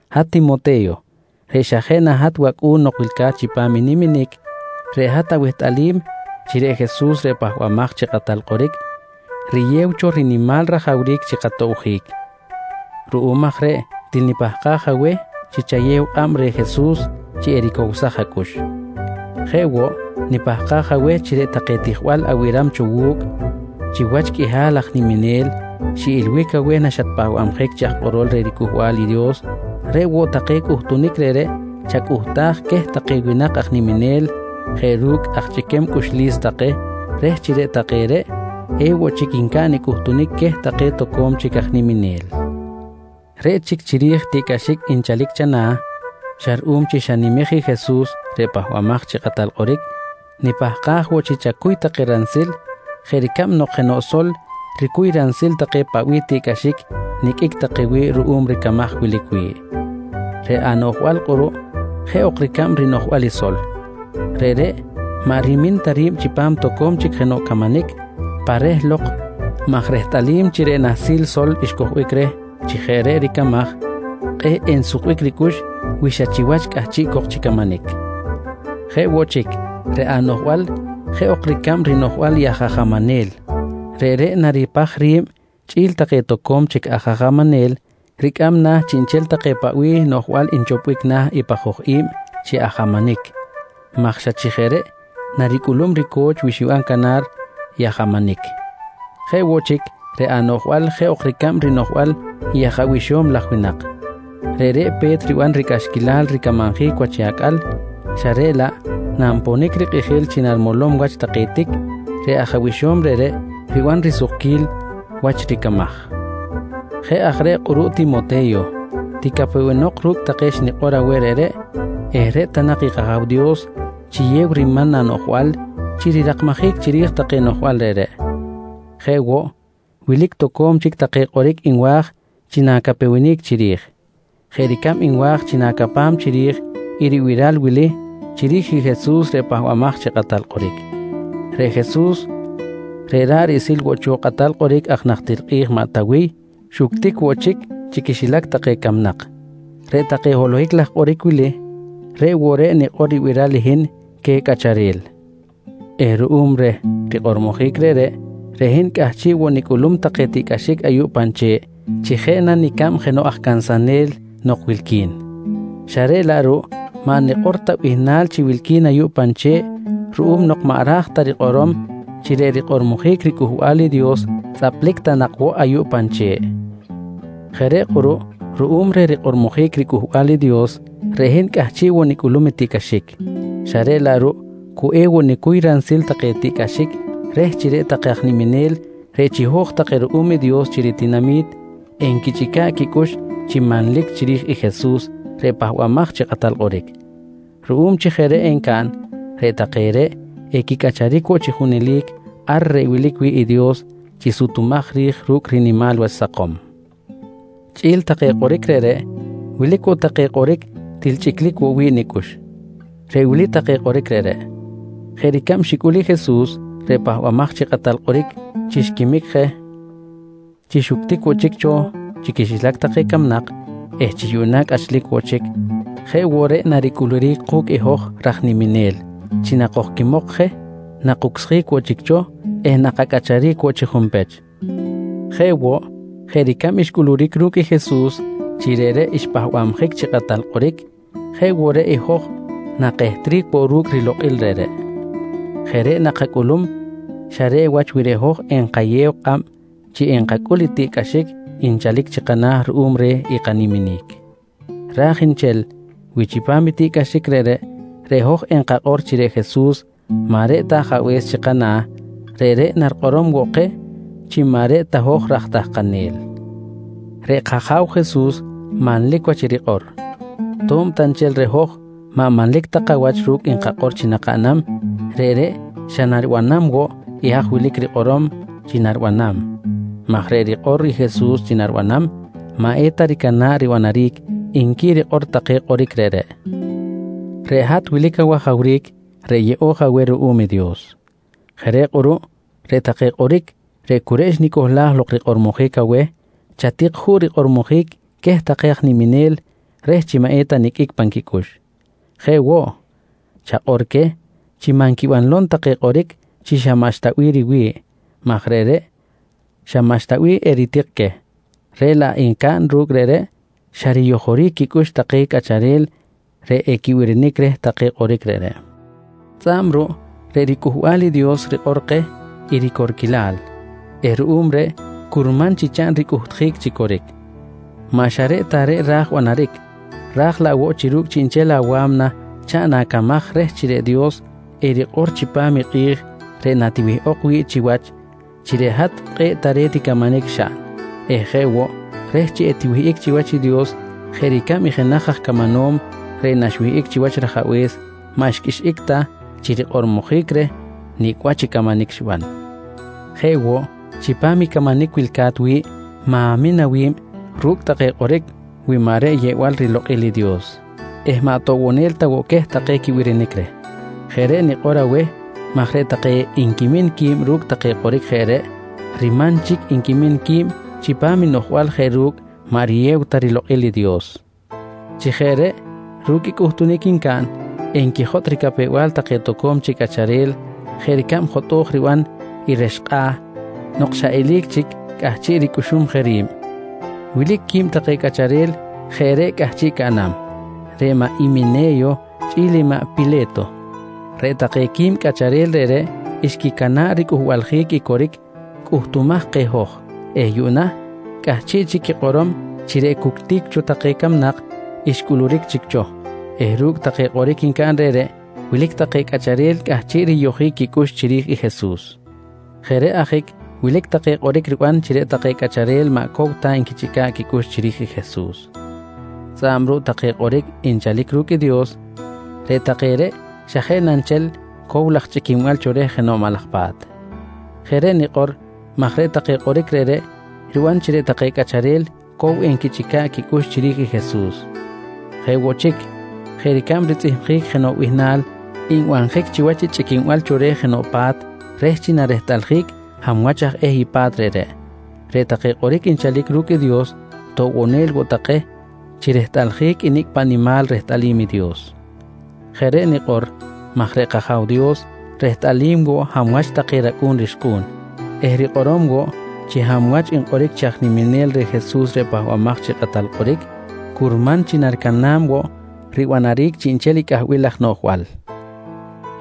Hat Timote̱yo reꞌ xa jeꞌ na hat wacꞌu̱n nok wilca̱t chipam i niminic, reꞌ hat awehtꞌalim chi reꞌ Jesus reꞌ Pahbamaj chi Kꞌatal Kꞌoric riyew cho rinimal rajawric chi katobjic. Ruꞌum aj reꞌ til nipahkaj aweh chi chayew kꞌab reh Jesus chi ericowsaj acꞌux. Jeꞌ woꞌ, nipahkaj aweh chi reꞌ take tijbal abiram cho wu̱cꞌ chiwach qꞌuihal aj niminel xiꞌilbic aweh naxatpahbabjic chi aj kꞌorol reh riCꞌuhbal i Dios, reꞌ woꞌ take cꞌuhtunic reꞌreꞌ chacꞌuhtaj queh take winak aj niminel jeꞌ ru̱cꞌ aj chꞌiquem cꞌuxlis take reh chi reꞌ take reꞌ, ewoꞌ chic ncaꞌn i cꞌuhtunic queh take toco̱m chic aj niminel. Reꞌ chic chiri̱j i tiꞌcꞌaxic nchalic chana̱ xa ruꞌum chi xanimej i Jesus reꞌ Pahbamaj chi Kꞌatal Kꞌoric, nipahkaj woꞌ chi chacuy take ransil jeꞌ ricab nok jenoꞌ sol ricuy ransil take paꞌ bih tiꞌcꞌaxic niqꞌuic take wi̱ꞌ ruꞌum ricamaj wilic wi̱ꞌ. Reꞌ anoꞌjbal kꞌuruꞌ jeꞌ ok ricab i rinoꞌjbal i sol. Reꞌreꞌ maꞌ rimin ta ri̱b chipam toco̱m chic jenoꞌ camanic pa reh lok maj rehtꞌalim chi reꞌ nahsil sol xcojbic reh chi jeꞌ reꞌ ricamaj, kꞌe̱ꞌ ensukbic ricꞌux wi xa chiwach cꞌahchiꞌ cok chi camanic. Jeꞌ woꞌ chic, reꞌ anoꞌjbal jeꞌ ok ricab rinoꞌjbal i aj ajamanel. Reꞌreꞌ naripaj ri̱b chꞌi̱l take toco̱m chic aj ajamanel, ricꞌam na̱ chiꞌnchel take paꞌ bih take noꞌjbal nchopbic na̱ i pajoj i̱b chi ajamanic maj xa chi jeꞌ reꞌ naricꞌulum rico̱ch wi xiban canar ajamanic. Jeꞌ woꞌ chic, reꞌ anoꞌjbal jeꞌ ok ricab rinoꞌjbal i aj abixo̱m laj winak. Reꞌreꞌ pe̱t riban ricꞌaxquilal ricamanjic wach i acꞌal xa reꞌ laꞌ nanponic rikꞌijil chi narimolom wach take tic, reꞌ aj abixo̱m reꞌreꞌ riban risukquil wach i ricamaj. Jeꞌ aj reꞌ kꞌuruꞌ Timote̱yo, ticapewenok ru̱cꞌ take xnikꞌor aweh reꞌreꞌ eh reꞌ ta nak i kAja̱w Dios chiyew riman anoꞌjbal chi rirakmajic chiri̱j take noꞌjbal reꞌreꞌ. Jeꞌ woꞌ wilic toco̱m chic take kꞌoric nwa̱j chi na̱capewenic chiri̱j. Jeꞌ ricab nwa̱j chi na̱capam chiri̱j i ribiral wili chiri̱j i Jesus reꞌ Pahbamaj chi Kꞌatal Kꞌoric: Reꞌ Jesus reꞌ ra̱ꞌ riꞌsil woꞌ cho i kꞌatal kꞌoric aj najtir kꞌi̱j maꞌ Tawiy, xuctic woꞌ chic chi quixilac take camnak. Reꞌ take holohic laj kꞌoric wili, reꞌ woꞌ reꞌ nikꞌor ribiral i hin queh cꞌacharel eh ruꞌum reh rikꞌormojic reꞌreꞌ, reꞌ hin cꞌahchiꞌ woꞌ nicꞌulum take tiꞌcꞌaxic ayuꞌ pan che̱ꞌ chi jeꞌ na nicab jenoꞌ aj cansanel nok wilqui̱n. Xa reꞌ laꞌ ruꞌ maꞌ nikꞌor ta bihnal chi wilqui̱n ayuꞌ pan che̱ꞌ ruꞌum nok maꞌ ra̱j ta rikꞌorom chi reꞌ rikꞌormojic riCꞌuhbal i Dios tzꞌaplic ta nak woꞌ ayuꞌ pan che̱ꞌ. Jeꞌ reꞌ kꞌuruꞌ ruꞌum reh rikꞌormojic riCꞌuhbal i Dios reꞌ hin cꞌahchiꞌ woꞌ nicꞌulum tiꞌcꞌaxic, xa reꞌ laꞌ ruꞌ cu ewoꞌ nicuy ransil take tiꞌcꞌaxic reh chi reꞌ take aj niminel reꞌ chiho̱j take ruꞌum i Dios chi ritinami̱t enquichꞌica̱ꞌ quicꞌux chi manlic chiri̱j i Jesus reꞌ Pahbamaj chi Kꞌatal Kꞌoric. Ruꞌum chi jeꞌ reꞌ encaꞌn, reꞌ take reꞌ equicꞌacharic woꞌ chi junelic ar reꞌ wilic wi̱ꞌ i Dios chi sutumaj ri̱j ru̱cꞌ rinimal wach sakom. Chꞌi̱l take kꞌoric reꞌreꞌ, wilic woꞌ take kꞌoric til chꞌiclic woꞌ wi̱ꞌ nicꞌux. Reꞌ wili take kꞌoric reꞌreꞌ: “Jeꞌ ricab xicꞌul i Jesus reꞌ Pahbamaj chi Kꞌatal Kꞌoric chi xquimic je, chi xuctic woꞌ chic cho chi quixilac take camnak eh chi yuꞌna cꞌachlic woꞌ chic, jeꞌ woꞌ reꞌ naricꞌuluric ku̱cꞌ hoj raj niminel chi nakojquimok je, nakucsjic woꞌ chic cho eh nakacꞌacharic woꞌ chi junpech. Jeꞌ woꞌ, jeꞌ ricab xcꞌuluric ru̱cꞌ i Jesus chi reꞌreꞌ xpahbabjic chi Kꞌatal Kꞌoric, jeꞌ woꞌ reꞌ i hoj nakehtric woꞌ ru̱cꞌ i rilokꞌil reꞌreꞌ. Jeꞌ reꞌ nakacꞌulum xa reꞌ wach wi reꞌ hoj enkayew kꞌab chi enkacꞌul i tiꞌ cꞌaxic nchalic chi kana̱ ruꞌum reh i kaniminic. Ra̱j nchel wi chipam i tiꞌcꞌaxic reꞌreꞌ, reꞌ hoj enkakꞌor chi reꞌ Jesus maꞌ reꞌ ta Ajabe̱s chi kana̱, reꞌreꞌ narikꞌorom woꞌ keh chi maꞌ reꞌ ta hoj raj tahkanel. Reꞌ kAja̱w Jesus manlic wach i rikꞌor. To̱b ta nchel reꞌ hoj maꞌ manlic ta kawach ru̱cꞌ nkakꞌor chi nakaꞌnam, reꞌreꞌ xa naribanam woꞌ i haj wilic rikꞌorom chi naribanam maj reꞌ rikꞌor i Jesus chi naribanam, maꞌ eta ricana̱ꞌ ribanaric, nqui rikꞌor take kꞌoric reꞌreꞌ. Reꞌ hat wilic awajawric reꞌ yeꞌo̱j aweh ruꞌum i Dios. Jeꞌ reꞌ kꞌuruꞌ reꞌ take kꞌoric cu reꞌ xnicohlaj lok rikꞌormojic aweh chatik juꞌ rikꞌormojic queh take aj niminel reh chi maꞌ eta niqꞌuic pan quicꞌux. Jeꞌ woꞌ, chakꞌor queh chi maꞌ nquibanlom take kꞌoric chi xa maꞌxta bih riwi̱ꞌ maj reꞌreꞌ xa maꞌxta bih eritik queh, reꞌ laꞌ encaꞌn ru̱cꞌ reꞌreꞌ xa riyojoric quicꞌux take cꞌacharel reꞌ equibirinic reh take kꞌoric reꞌreꞌ. Tzꞌa̱b ruꞌ reꞌ riCꞌuhbal i Dios rikꞌor keh i ricorquilal eh ruꞌum reꞌ curman chi chaꞌn ricꞌuhtjic chi coric. Maꞌ xa reꞌ ta reꞌ ra̱j banaric ra̱j laꞌ woꞌ chi ru̱cꞌ chiꞌnchel awa̱mna chaꞌn acamaj reh chi reꞌ Dios erikꞌor chipam i kꞌi̱j reꞌ natiwihꞌok wi̱ꞌ chiwach chi reꞌ hat kꞌe̱ꞌ tare̱t i camanic xaꞌn eh jeꞌ woꞌ reh chi etiwihꞌic chiwach i Dios jeꞌ ricab i jenaj aj camanom reꞌ naxwihꞌic chiwach rajabe̱s maꞌ xqꞌuixꞌic ta chi rikꞌormojic reh nicꞌ wach i camanic xiban. Jeꞌ woꞌ, chipam i camanic wilca̱t wi̱ꞌ ma̱min awi̱b ru̱cꞌ take kꞌoric wi maꞌ reꞌ yeꞌbal rilokꞌil i Dios eh maꞌ toꞌbonel ta woꞌ queh take quibirinic reh. Jeꞌ reꞌ nikꞌor aweh maj reꞌ take nquimin qui̱b ru̱cꞌ take kꞌoric jeꞌ reꞌ riman chic nquimin qui̱b chipam i noꞌjbal jeꞌ ru̱cꞌ maꞌ riyew ta rilokꞌil Dios. Chi jeꞌ reꞌ ru̱cꞌ i cꞌuhtunic ncaꞌn, nquijotꞌ ricapew-bal take toco̱m chic cꞌacharel jeꞌ ricab jotꞌo̱j riban i rex kꞌa̱ nok xa eli̱c chic cꞌahchiꞌ ricꞌuxum je ri̱b. Wilic quib take cꞌacharel jeꞌ reꞌ cꞌahchiꞌ caꞌnam, reꞌ Himene̱yo chꞌi̱l i maꞌ Pile̱to. Reꞌ take qui̱b cꞌacharel reꞌreꞌ xquicana̱ꞌ ricꞌuhbaljic i coric cꞌuhtumaj keh hoj eh yuꞌna cꞌahchiꞌ chic quikꞌorom chi reꞌ cuctic cho take camnak xcꞌuluric chic cho eh ru̱cꞌ take kꞌoric ncaꞌn reꞌreꞌ, wilic take cꞌacharel cꞌahchiꞌ riyojic quicꞌux chiri̱j i Jesus. Jeꞌ reꞌ ajic wilic take kꞌoric riban chi reꞌ take cꞌacharel maꞌ cow ta nquichꞌica̱ꞌ quicꞌux chiri̱j i Jesus. Tzꞌa̱b ruꞌ take kꞌoric nchalic ru̱cꞌ i Dios, reꞌ take reꞌ xa jeꞌ na nchel cow laj chꞌiquinbal cho reh jenoꞌ maꞌ laj pa̱t. Jeꞌ reꞌ nikꞌor maj reꞌ take kꞌoric reꞌreꞌ riban chi reꞌ take cꞌacharel cow enquichꞌica̱ꞌ quicꞌux chiri̱j i Jesus. Jeꞌ woꞌ chic, jeꞌ ricab ritzꞌihmjic jenoꞌ bihnal nbanjic chiwach i chꞌiquinbal cho reh jenoꞌ pa̱t reh chi narehtꞌaljic hab wach aj eh i pa̱t reꞌreꞌ, reꞌ take kꞌoric nchalic ru̱cꞌ i Dios toꞌbonel woꞌ take chi rehtꞌaljic i nicꞌ paꞌ nimal rehtꞌalim i Dios. Jeꞌ reꞌ nikꞌor maj reꞌ kAja̱w Dios rehtꞌalim woꞌ hab wach take racꞌu̱n rixkꞌu̱n eh rikꞌorom woꞌ chi hab wach nkꞌoric chi aj niminel reh Jesus reꞌ Pahbamaj chi Kꞌatal Kꞌoric, curman chi naricana̱b woꞌ ribanaric chiꞌnchel i cꞌahbil laj noꞌjbal.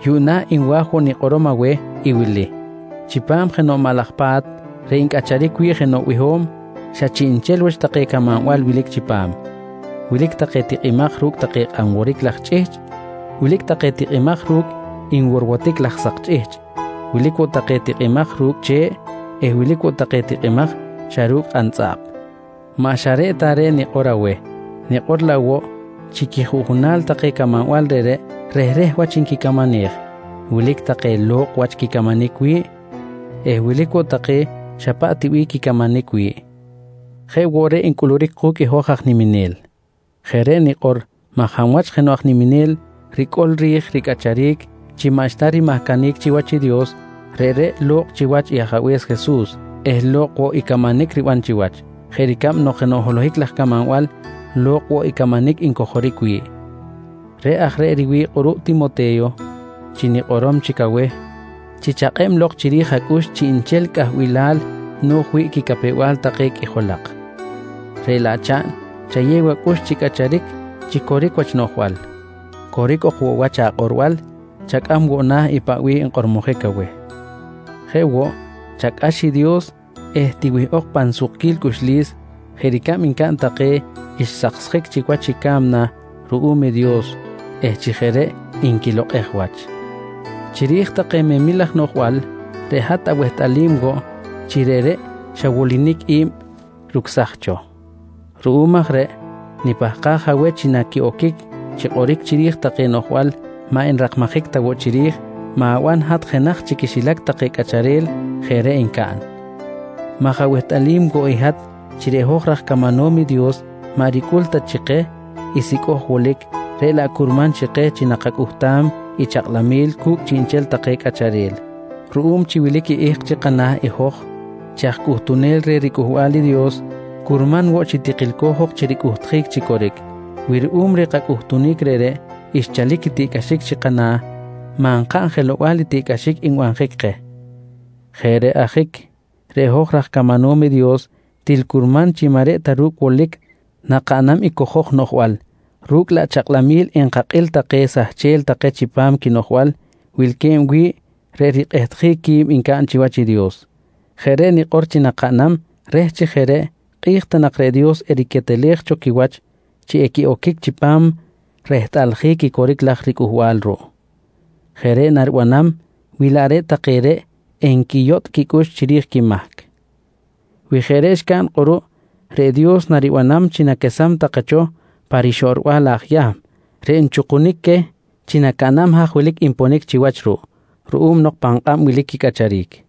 Yuꞌna nwa̱j nikꞌorom woꞌ aweh tak i wili: Chipam jenoꞌ maꞌ laj pa̱t reꞌ ncꞌacharic wi̱ꞌ jenoꞌ biho̱m, xa chiꞌnchel wach take camanbal wilic chipam. Wilic take tikꞌimaj ru̱cꞌ take kꞌan woric laj chꞌihchꞌ. Wilic take tikꞌimaj ru̱cꞌ nworwotic laj sak chꞌihchꞌ. Wilic woꞌ take tikꞌimaj ru̱cꞌ che̱ꞌ eh wilic woꞌ take tikꞌimaj xa ru̱cꞌ kꞌantzꞌaꞌp. Maꞌ xa ta reꞌ ta reꞌ nikꞌor aweh tak, nikꞌor laꞌ woꞌ chi quijuꞌjunal take camanbal reꞌreꞌ rehreh wach nquicamanej. Wilic take lo̱kꞌ wach quicamanic wi̱ꞌ eh wilic woꞌ take xa paꞌ ti bih quicamanic wi̱ꞌ. Jeꞌ woꞌ reꞌ ncꞌuluric ku̱cꞌ i hoj aj niminel. Jeꞌ reꞌ nikꞌor maj hab wach jenoꞌ aj niminel ricꞌol ri̱j ricꞌacharic chi maꞌxta rimahcanic chiwach i Dios, reꞌreꞌ lo̱kꞌ chiwach i Ajabe̱s Jesus eh lo̱kꞌ woꞌ i camanic riban chiwach, jeꞌ ricab nok jenoꞌ holohic laj camanbal, lo̱kꞌ woꞌ i camanic ncojoric wi̱ꞌ. Reꞌ aj reꞌ riwi̱ꞌ kꞌuruꞌ Timote̱yo, chi nikꞌorom chic aweh chi chakꞌeb lok chiri̱j acꞌux chiꞌnchel cꞌahbilal no̱j wi̱ꞌ quicapew-bal take qꞌuijolak. Reꞌ laꞌ chaꞌn chayew acꞌux chi cꞌacharic chi coric wach anoꞌjbal. Coric ok woꞌ wach akꞌorbal, chacꞌam woꞌ na̱ paꞌ bih nkꞌormojic aweh. Jeꞌ woꞌ, chacꞌax i Dios eh tiwihꞌok tak pan sukquil cꞌuxlis, jeꞌ ricab ncaꞌn take xsaksjic chic wach i ca̱mna ruꞌum i Dios eh chi jeꞌ reꞌ nquilokꞌej wach. Chiri̱j take memil laj noꞌjbal, reꞌ hat awehtꞌalim woꞌ chi reꞌreꞌ xa wolinic i̱b rucsaj cho. Ruꞌum aj reꞌ nipahkaj aweh chi naquiꞌoquic chi kꞌoric chiri̱j take noꞌjbal maꞌ nrakmajic ta woꞌ chiri̱j, ma̱ban hat jenaj chi quixilac take cꞌacharel jeꞌ reꞌ ncaꞌn maj awehtꞌalim woꞌ i hat chi reꞌ hoj raj camanom i Dios maꞌ ricꞌul ta chi keh i sicꞌoj wolic reꞌ laꞌ curman chi keh chi nakacꞌuhtam i kachakꞌlamil cu̱cꞌ chiꞌnchel take cꞌacharel. Ruꞌum chi wilic i ihk chi kana̱ i hoj chi aj cꞌuhtunel reh riCꞌuhbal i Dios, curman woꞌ chi tikilco̱j ok chi ricꞌuhtjic chi coric. Wi ruꞌum reh kacꞌuhtunic reꞌreꞌ xchalic i tiꞌcꞌaxic chi kana̱, maꞌ nkaꞌn jelow-bal i tiꞌcꞌaxic nbanjic keh. Jeꞌ reꞌ ajic, reꞌ hoj raj camanom i Dios til curman chi maꞌ reꞌ ta ru̱cꞌ wolic nakaꞌnam i cojoj noꞌjbal, ru̱cꞌ laꞌ chakꞌlamil enkakꞌil take sahchel take chipam quinoꞌjbal wilque̱b wi̱ꞌ reꞌ rikꞌehtjic quib ncaꞌn chiwach i Dios. Jeꞌ reꞌ nikꞌor chi nakaꞌnam reh chi jeꞌ reꞌ, kꞌi̱j ta nak reꞌ Dios eriquetelej cho quiwach chi equiꞌoquic chipam rehtꞌalij i coric laj ricꞌuhbal ruꞌ. Jeꞌ reꞌ naribanam wi laꞌ reꞌ take reꞌ enquiyotꞌ quicꞌux chiri̱j i quimahc. Wi jeꞌ reꞌ xcaꞌn kꞌuruꞌ reꞌ Dios naribanam chi naquesam take cho pa rixoꞌrbal aj Yahm reꞌ nchukunic queh chi nacaꞌnam haj wilic nponic chiwach ruꞌ ruꞌum nok pan kꞌab wilic quicꞌacharic.